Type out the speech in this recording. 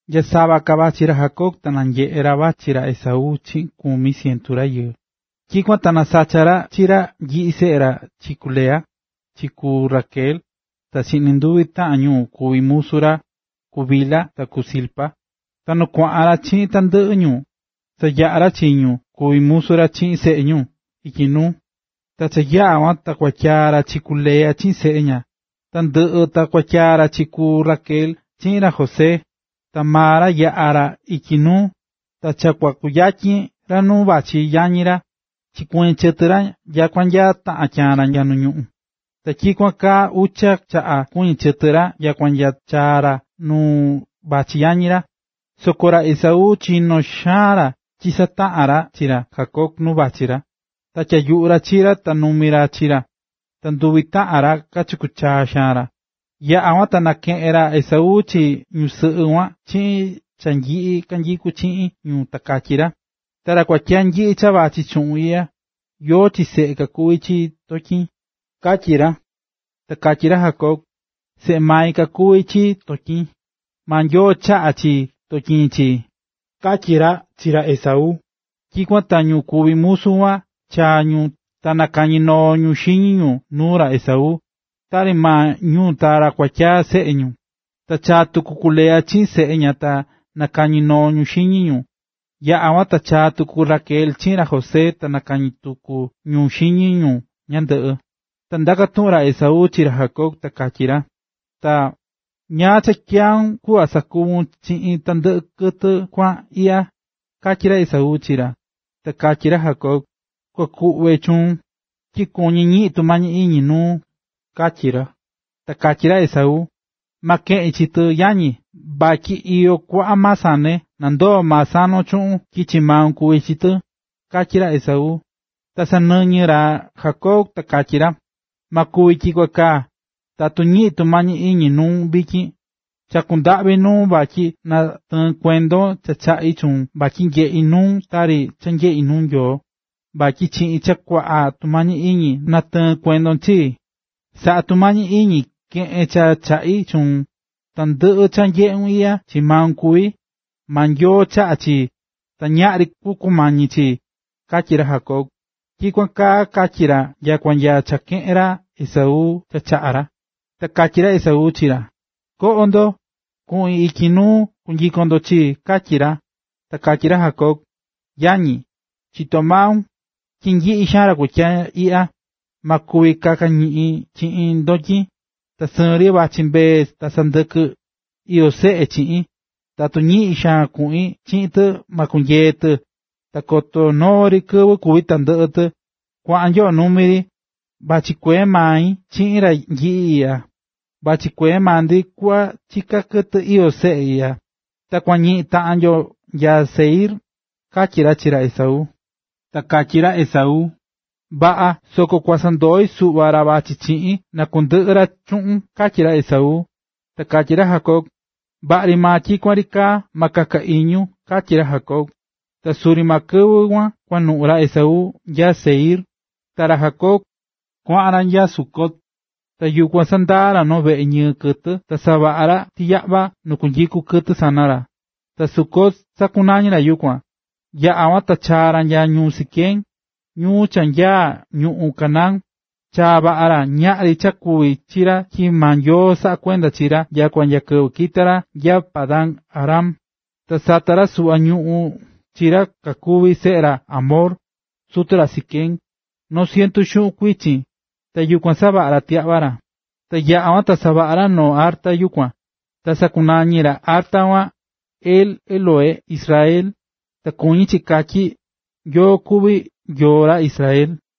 Nya sava ka vachí ra Jacob, ta nanyeꞌe̱ ra vachí ra Esaú chiꞌin kumi cientu rayɨɨ. Tyikuan ta nasacha̱ ra chi ra nyiꞌi seꞌe ra chi ku Lea, chi ku Raquel, ta chi nduvi taꞌan ñu kuvi̱ musu ra, ku Bilha ta ku Zilpa. Ta nu kuaꞌan ra chiꞌin tandɨꞌɨ ñu, sayaꞌa̱ ra chi ñu kuví musu ra chiꞌin seꞌe ñu ityi nuu, ta yaꞌa kuan ta kuatyaa̱ ra chi ku Lea chiꞌin seꞌe ña, ta nu ndɨꞌɨ ta kuatyaa̱ ra chi ku Raquel chiꞌin ra José. Ta maa ra yaꞌa̱ ra ityi nuu, ta cha kua kuyatyin ra nu vachí yañi ra, chikuɨñɨ̱ chɨtɨ ra nya taꞌan tyaan ra nu ñuꞌún. Ta tyikuan kaa ucha chaꞌa chikuɨñɨ̱ chɨtɨ ra nyakua nya chaa̱ ra nu vachí yañi ra. Soko ra Esaú chinó xaan ra chisataꞌa̱n ra chi ra Jacob nu vachí ra, ta tyayuꞌu̱ ra chi ra ta nanumi̱ ra chi ra, ta nduvi taꞌan ra kachaku̱ xaan ra. Yaꞌa̱ kuan ta nanyeꞌe̱ ra Esaú chi ñusɨꞌɨ kuan chiꞌin cha nyiꞌi kanyikú chiꞌin ñu ta katyí ra: ―Ta ra kuatyaa nyiꞌi cha vachí chuꞌun iꞌya, ¿yóó chi seꞌe kakuví chi ndotyin? ―katyí ra. Ta katyí ra Jacob: ―Seꞌe mai kakuví chi ndotyin, maa Nyoo chaꞌa̱ chi ndotyin chii ―katyí ra chi ra Esaú. Tyikuan ta ñu kuví musu kuan chaa̱ ñu ta nakañinoo̱ ñu xiñi ñu nuu ra Esaú, tari maa ñu ta ra kuatyaa seꞌe ñu. Ta chaa̱ tuku ku Lea chiꞌin seꞌe ña ta nakañinoo̱ ñu xiñi ñu, yaꞌa̱ kuan ta chaa tuku ku Raquel chiꞌin ra José ta nakañinoo̱ tuku ñu xiñi ñu ñandɨꞌɨ. Ta ndaka̱ tuꞌun ra Esaú chi ra Jacob, ta katyí ra: ―Ta ¿ñáá cha tyaún kuꞌva sakuvun chiꞌin tandɨꞌɨ kɨtɨ kuaꞌa iꞌya? ―katyí ra Esaú chi ra. Ta katyí ra Jacob: ―Kua kuꞌve chuun, tyi kuñí ñiꞌin tumañi iñi nuun ―katyí ra. Ta katyí ra Esaú: ―Ma keꞌin chi tɨ, yañi, vatyi cha iyó kuaꞌa maa sane, na ndoo maa sanon chuun tyi chi maun kuvi chi tɨ ―katyí ra Esaú. Ta sanɨñɨ̱ ra Jacob ta katyí ra: ―Ma kuvi tyikuan kaa. Tatu ñiꞌín tumañi iñi nuun vityin, chakú ndaꞌvi nuun vatyi natɨɨn kuendon cha chaꞌí chuun vatyi nyeꞌí nuun tari cha nyeꞌí nuu Nyoo, vatyi chiꞌin cha kuaꞌa tumañi iñi natɨɨ̱n kuendon chii. Sa̱ꞌa tumañi iñi ke̱ꞌen cha chaꞌi̱ chuun, tandɨꞌɨ cha nyeꞌún iꞌya chii mai kuví, maa Nyoo chaꞌa̱ chii, ta ñaꞌri kua kumañi chii ―katyí ra Jacob. Ta tyikuan kaa katyí ra nyakua nya cha keꞌe̱n ra Esaú cha chaꞌá ra. Ta katyí ra Esaú chi ra: ―Ko̱ꞌo ndo, kuꞌin ityi nuu ta kunyiko ndo chii ―katyí ra. Ta katyí ra Jacob: ―Yañi, chitó maun tyi nyiꞌi xaan ra kuatyaa iꞌya, ma kuvi kaka ñiꞌin chiꞌin ndotyin, ta sɨɨn ri vachí mbee ta sandɨkɨ iyó seꞌe chiꞌin, tatu ñiꞌin xaan kuꞌin chiꞌin tɨ ma kunyee tɨ, ta koto noo ri kɨvɨ kúvi tandɨꞌɨ tɨ. Kua̱ꞌan nyoꞌo numi ri, vachí kuee mai chiꞌin ra nyiꞌi iꞌya, vachí kuee maa ndi kuꞌva chiká kɨtɨ iyó seꞌe iꞌya, ta kua ñiꞌin taꞌan yo nya Seir ―katyí ra chi ra Esaú. Ta katyí ra Esaú: ―Vaꞌa, soko kua sandoi suꞌva ra vachí chiꞌin, na kundɨꞌɨ ra chuꞌun ―katyí ra Esaú. Ta katyí ra Jacob: ―Vaꞌa ri maa tyikuan ri kaa, ma kaka iñun ―katyí ra Jacob. Ta suri maa kɨvɨ kuan kuanuꞌu̱ ra Esaú nya Seir. Ta ra Jacob, kuaꞌan ra nya Sucot, ta yukuan sandaa̱ ra veꞌe ñɨɨ kɨtɨ ta savaꞌa̱ ra tiyaꞌva nu kunyiku kɨtɨ sana ra. Ta Sucot sakunañi̱ ra yukuan. Yaꞌa kuan ta chaa̱ ra nya ñuu Siquem, ñuu cha nyaá ñuꞌún Canaán, chaa̱ vaꞌa ra, ñaꞌri cha kuvi̱ chi ra tyi maa Nyoo saꞌá kuenda chi ra nya kɨvɨ kita̱ ra nya Padan-aram. Ta sata̱ ra suꞌva ñuꞌún chi ra kakuví seꞌe ra Hamor, sutu ra Siquem, noo cientu xuꞌun chikɨꞌɨ̱. Ta yukuan savaꞌa̱ ra tiyaꞌva ra. Ta yaꞌa̱ kuan ta savaꞌa̱ ra noo arta yukuan. Ta sakunañi̱ ra arta kuan: El-Elohé-Israel (Ta kuñí chi katyí: Nyoo kuví Nyoo ra Israel).